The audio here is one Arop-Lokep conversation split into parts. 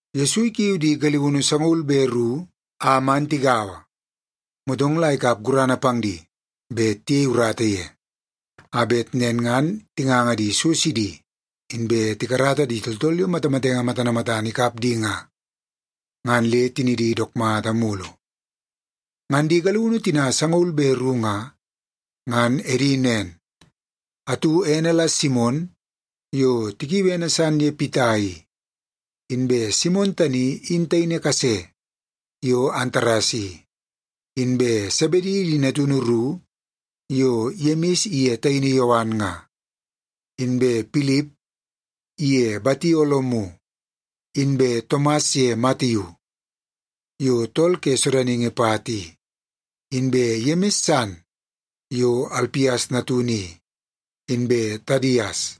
Yesu ikiu di galiunu sangaul be ru a man tigaua, motong la ikap gurana pang di bet tiyei urata ye, a bet nen ngan tinganga di so sidi, inbe tikarata di tooltool yo matamatenge matana matana ikap di nga, ngan le tinidi dook mata mulu. Ngan di galiunu tina sangaul be ru nga, ngan edi nen: atu ene la Simon yo tikiui ene san ye Pita i; inbe Simon tani in taini kase yo Antares i; inbe Sebedi di natunu ru yo Yemis iye taini Yowan nga; inbe Pilip iye Batolomiu inbe Tomas ye Matiu yo tool ke sodaningi pat i; inbe Yemis san yo Alpias natunu i; inbe Tadias;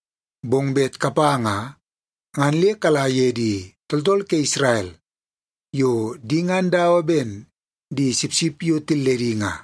Bong bet kapa nga, ngan le kala ye di tooltool ke Isrel yo di ngan dawa ben di sipsip yo tilledi nga.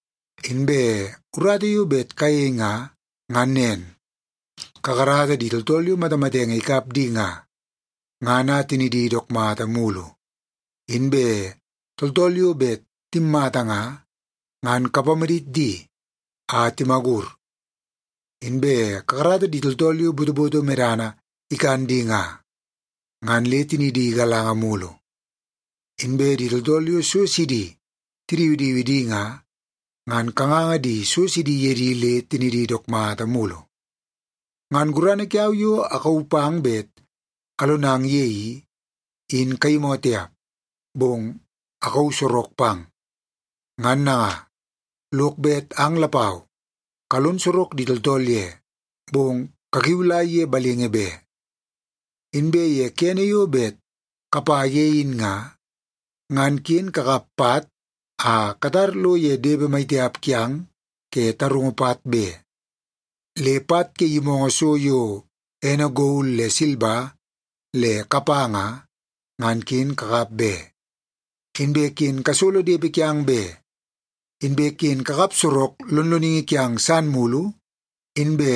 Inbe urata yo bet kayei nga, ngan nen. Kakarata di tooltool yo matamatenge ikap di nga, ngan a tinidi dook mata mulu. Inbe tooltool bet timmata nga, ngan kapamadit di a timagur. Inbe kakarata di tooltool yo botoboto medana ikan di nga, ngan le tinidi galanga mulu. Inbe di tooltool yo so sidi tidiwidiwi di nga, ngan kanganga so sidi ye di le tinidi dook mata mulu. Ngan gurana kiau yo akauu pang bet alonang ye i, in kayimoo tiap, bong akauu sorok pang. Ngan nanga, lok bet ang lapau kalon sorok di tooltool ye, bong kakiulai ye balingi be. Inbe ye kene yo bet kapa ye in nga, ngan ken kakap pat a katar lo ye depe mai tiap kiang ke tarungu pat be. Le pat ke yimoongoo so yo ene gol le silba le kapa nga, ngan ken kakap be. Inbe ken kasolo depe kiang be. Inbe ken kakap sorok lonloningi kiang san mulu, inbe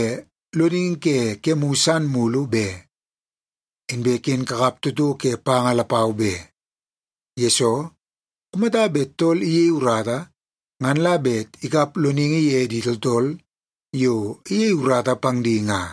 loningi ke kemu san mulu be. Inbe ken kakap toto ke panga lapau be. Yesoo, kumata bet tool iyei urata, ngan la bet ikap loningi ye di tooltool yo iyei urata pang di nga.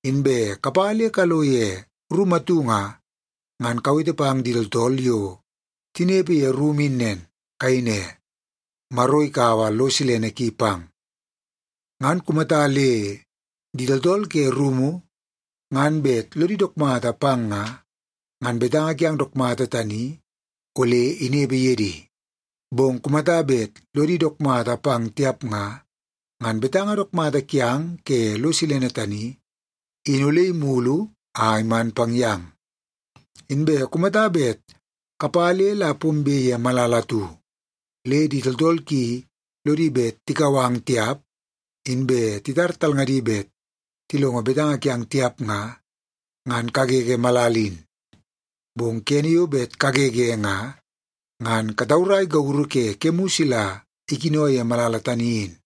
Inbe kapa le kalo ye rumu atu nga, ngan kawete pang di tooltool yo tinepe ye rumu in nen. Kayei ne, ‘Maro ikaua lo silene ki pang.’ Ngan kumata le di tooltool ke rumu ngan bet lodi dook mata pang nga, ngan betanga kiang dook mata tani ole inepe ye di. Bong kumata bet lodi dook mata pang tiap nga, ngan betanga dook mata kiang ke lo silene tani, in ole imulu a iman pang yang. Inbe kumata bet kapa le la pombe ye malala atu, le di tooltool ki lodi bet tikau ang tiap, inbe titar talngadi bet tilongo betanga kiang tiap nga, ngan kagege malala in. Bong kene yo bet kagege nga, ngan kataurai gauru ke kemu sila ikino ye malala tani in.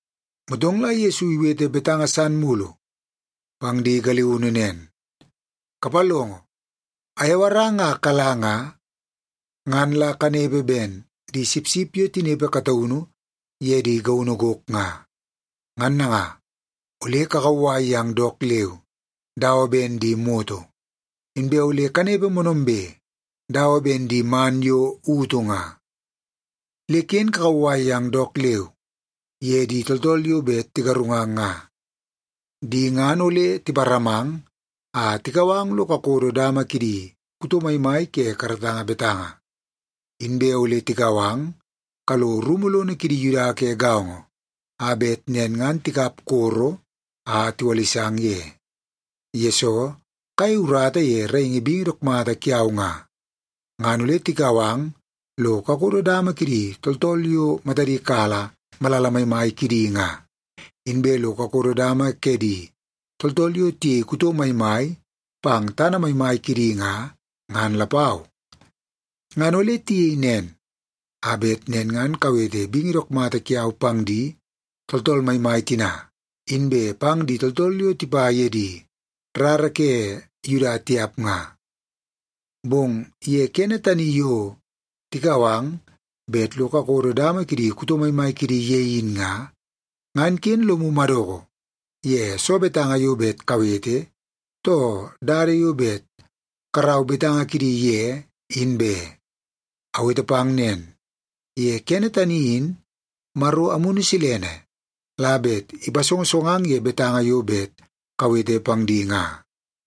Motong la Yesu iwete betanga san mulu pang di galiunu nen, “Kapalongo! Ayawarang a kala nga, ngan la kanepe ben di sipsip yo tinepe kataunu ye di gaunu gok nga. Ngan nanga, ole kakauwai yang dook leu dawa ben di moto, inbe ole kanepe moonoombe dawa ben di man yo utu nga. Le ken kakauwai yang dook leu ye di tooltool yo bet tigarungang nga. Di ngan ole tiparamang a tikau ang lo kakodo dama kidi kuto maimai ke karatanga betanga, inbe ole tikau ang kalo rumu lono kidi Yuda ke gaongo a bet nen ngan tikap koro a tiwalisang ye. Yesoo kayei urata ye raingi bingi dook mata kiau nga, ngan ole tikau ang lo kakodo dama kidi tooltool yo matadi kala malala maimai kidi nga, inbe lo kakodo dama ke di tooltool yo tiyei kuto maimai pang tana maimai kidi nga, ngan lapau. Ngan ole tiyei nen a bet nen ngan kawete bingi dook mata kiau pang di tooltool maimai tina, inbe pang di tooltool yo tipa ye di rara ke Yuda tiap nga. Bong ye kene tani yo tikau ang bet lo kakodo dama kidi kuto maimai kidi ye in nga, ngan ken lomu madoko ye soo betanga yo bet kawete, too dada yo bet karau betanga kidi ye, in be. Awete pang nen, ye kene tani in Maro Amunu Silene la bet ipasongosongang ye betanga yo bet kawete pang di nga.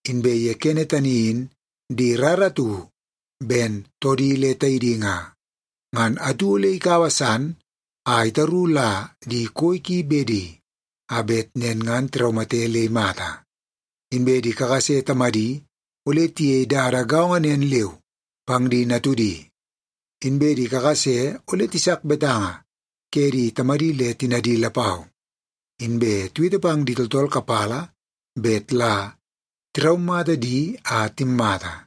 “Inbe ye kene tani in di rara atu ben toodi le taidi nga, ngan atu ole ikaua san a itaru la di koi ki bedi, a bet nen ngan tiraumate le imata. Inbe di kakase tamadi ole tiyei dada gaongo nen leu pang di natudi. Inbe di kakase ole tisak betanga ke di tamadi le tinadi lapau, inbe tiwete pang di tooltool kapala bet la tiraumata di a timmata.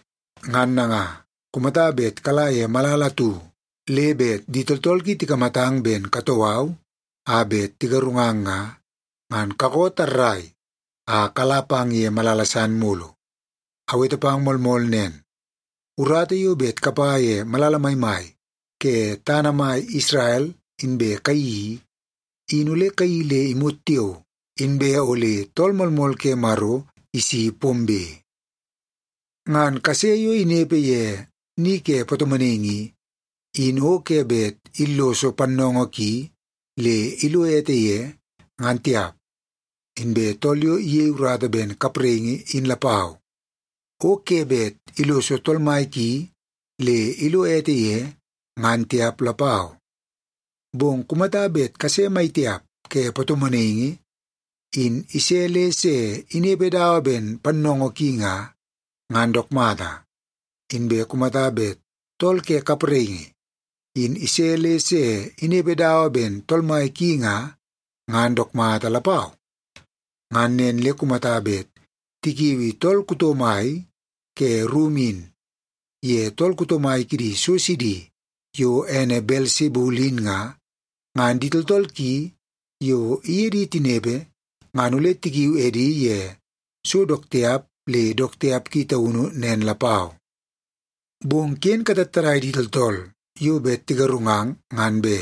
Ngan nanga, kumata bet kala ye malala atu, le bet di tooltool ki tikamatang ben katoo au a bet tigarungang nga, ngan kakoo tarrai a kala pang ye malala san mulu. Awete pang moolmool nen, urata yo bet kapa ye malala maimai ke tana mai Isrel inbe kayeii i, in ole kayeii le imot tiao, inbe ole Tool Moolmool ke Maro isi pombe. “Ngan kase yo inepe ye ni ke patomonaingi i, in o ke bet illoso pannoongoo ki le ilo ete ye, ngan tiap. Inbe tool yo iyei urata ben kapraingi in lapau, o ke bet illoso tool mai ki le ilo ete ye, ngan tiap lapau. Bong kumata bet kase mai tiap ke patomonaingi in ise le se inepe dawa ben pannoongoo ki nga, ngan dook mata. Inbe kumata bet tool ke kapraingi in ise le se inepe dawa ben tool mai ki nga, ngan dook mata lapau. Ngan nen le kumata bet tikiui kuto mai ke rumu in ye tool kuto mai kidi so sidi yo ene Belsebul in nga, ngan di tooltool ki yo iye di tinepe ngan ole tikiu edi ye so dook tiap le dook tiap ki taunu nen lapau. “Bong ken katattadai di tooltool yo bet tigarungang, ngan be.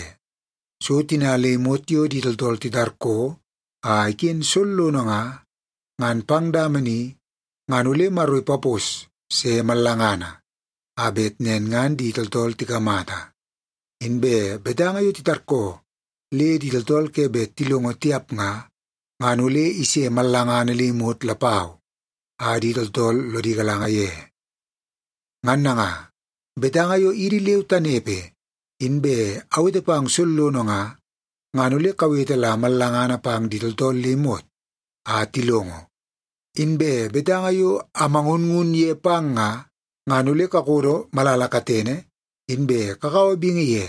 So tina le imot yo di tooltool titarkoo a iken sollono nga, ngan pang dama ni ngan ole Maro ipapos se mallangana a bet nen ngan di tooltool tikamata. Inbe betanga yo titarkoo le di tooltool ke bet tilongo tiap nga, ngan ole ise mallangana le imot lapau a di tooltool lodi galanga ye. Ngan nanga, betanga yo idi leu tanepe inbe awete pang sollono nga, ngan ole kawete la mallangana pang di tooltool le imot a tilongo. Inbe betanga yo amangunngun ye pang nga, ngan ole kakodo malala katene, inbe kakaua bingi ye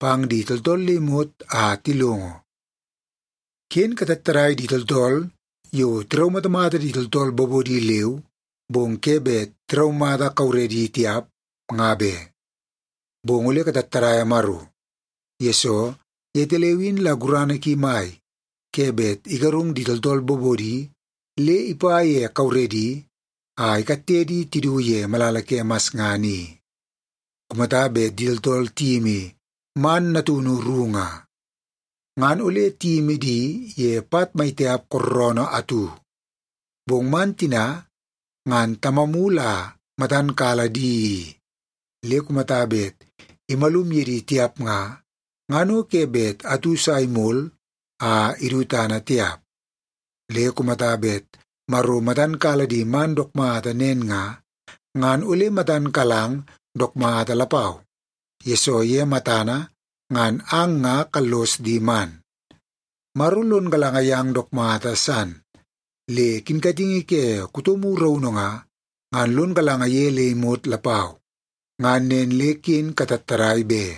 pang di tooltool le imot a tilongo. “Ken katattadai di tooltool yo tiraumatamata di tooltool bobodi leu, bong ke bet tiraumata kauredi tiap, nga be. Bong ole katattadaia Maro, yesoo yetaleu in la gurana ki mai ke bet igarung di tooltool bobodi le ipa ye kauredi a ikatte di tidu ye malala ke masngana i. Kumata bet di tooltool tiyimi man natunu ru nga, ngan ole tiyimi di ye pat mai tiap kooroonoo atu. Bong man tina ngan Tamamu la matan kala di i, le kumata bet imalum ye di tiap nga, ngan o ke bet atu sa imol a idu tana tiap. Le kumata bet Maro matan kala di man dook mata nen nga, ngan ole matan kalang dook mata lapau, yesoo ye matana ngan ang nga kallos di man. Maro lon galanga yang dook mata san, le kinkatingi ke kutomu raunu nga, ngan lon galanga ye le imot lapau. Ngan nen le ken katattadai be!”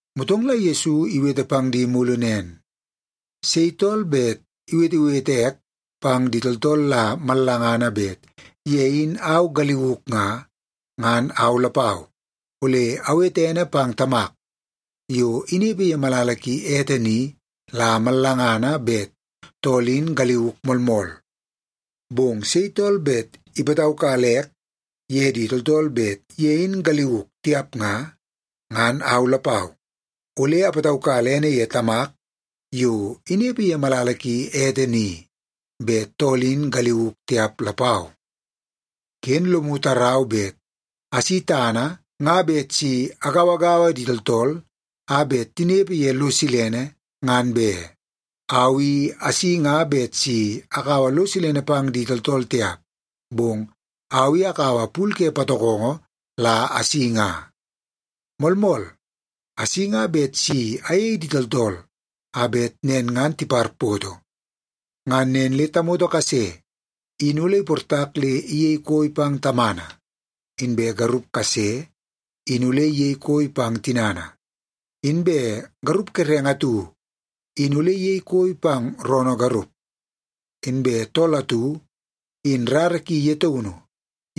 Motong la Yesu iwete pang di mulu nen, “Sei tool bet iwetewete ek pang di tooltool la mallangana bet ye in au galiuk nga, ngan au lapau, ole awete ene pang Tamak yo inepe ye malala ki ete ni la mallangana, bet tool in galiuk moolmool. Bong sei tool bet ipataukala ek ye di tooltool bet ye in galiuk tiap nga, ngan au lapau, ole apataukala ene ye Tamak yo inepe ye malala ki ete ni, bet tool in galiuk tiap lapau. “Ken lomu tarau bet asi tana nga bet si agauagaua di tooltool a bet tinepe ye lo silene, ngan be. Au i asi nga bet si akaua lo silene pang di tooltool tiap, bong au i akaua pul ke patokongo la asi nga. Moolmool, asi nga bet si ayei di tooltool a bet nen ngan tiparpoto. Ngan nen le ‘tamoto kase in ole iportak le iyei koi pang tamana, inbe garup kase in ole iyei koi pang tinana, inbe garup kerenge atu in ole iyei koi pang roonoo garup, inbe tool atu in rara ki ye taunu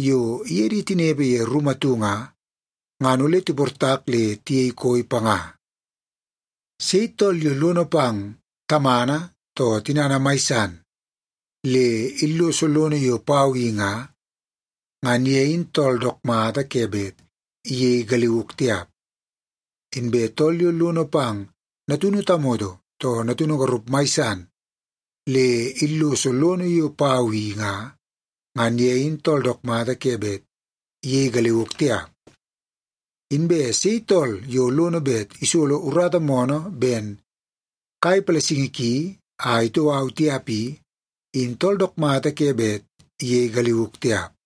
yo iye di tinepe ye rumu atu nga, ngan ole tiportak le tiyei koi panga.’ “Sei tool yo lono pang tamana too tinana mai san, le illoso lono yo pau i nga, ngan ye in tool dook mata ke bet iyei galiuk tiap. Inbe tool yo lono pang natunu tamoto too natunu garup mai san, le illoso lono yo pau i nga, ngan ye in tool dook mata ke bet iyei galiuk tiap. Inbe sei tool yo lono bet isolo urata moonoo ben kai palasingi ki a itoo au tiap i, in tool dook mata ke bet iyei galiuk tiap.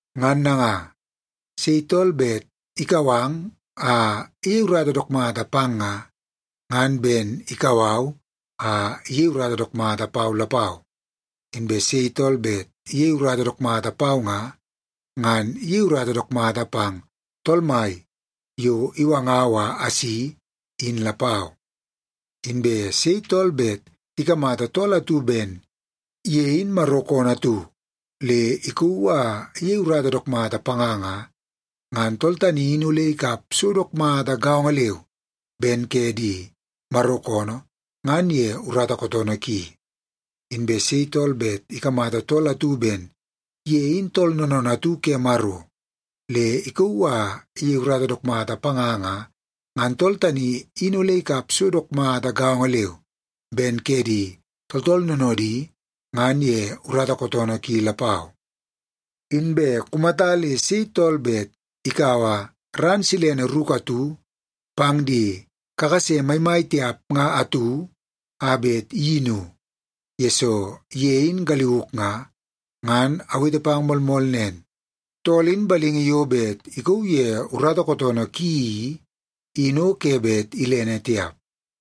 “Ngan nanga, sei tool bet ikau ang a iyei urata dook mata pang nga, ngan ben ikau au a iyei urata dook mata pau lapau. Inbe sei tool bet iyei urata dook mata pau nga, ngan iyei urata dook mata pang Tool Mai yo iwangau a asi, in lapau. Inbe sei tool bet ikamata tool atu ben ye in Maro koonoo atu le ikauu a iyei urata dook panga nga, ngan tool tani in ole ikap so dook mata gaongo leu ben ke di Maro koonoo ngan ye urata kootoonoo ki. Inbe sei tool bet ikamata tool atu ben ye in tool noonoonoo atu ke Maro le ikauu a iyei urata dook mata panga nga, ngan tool tani in ole ikap so dook mata gaongo leu ben ke di tooltool noonoodi ngan ye urata kootoonoo ki lapau. Inbe kumata le sei tool bet ikaua ran silene ruku atu pang di kakase maimai tiap nga atu a bet iyinu, yesoo ye in galiuk nga, ngan awete pang moolmool nen, tool in balingi yo bet ikauu ye urata kootoonoo ki i, in o ke bet ilene tiap.”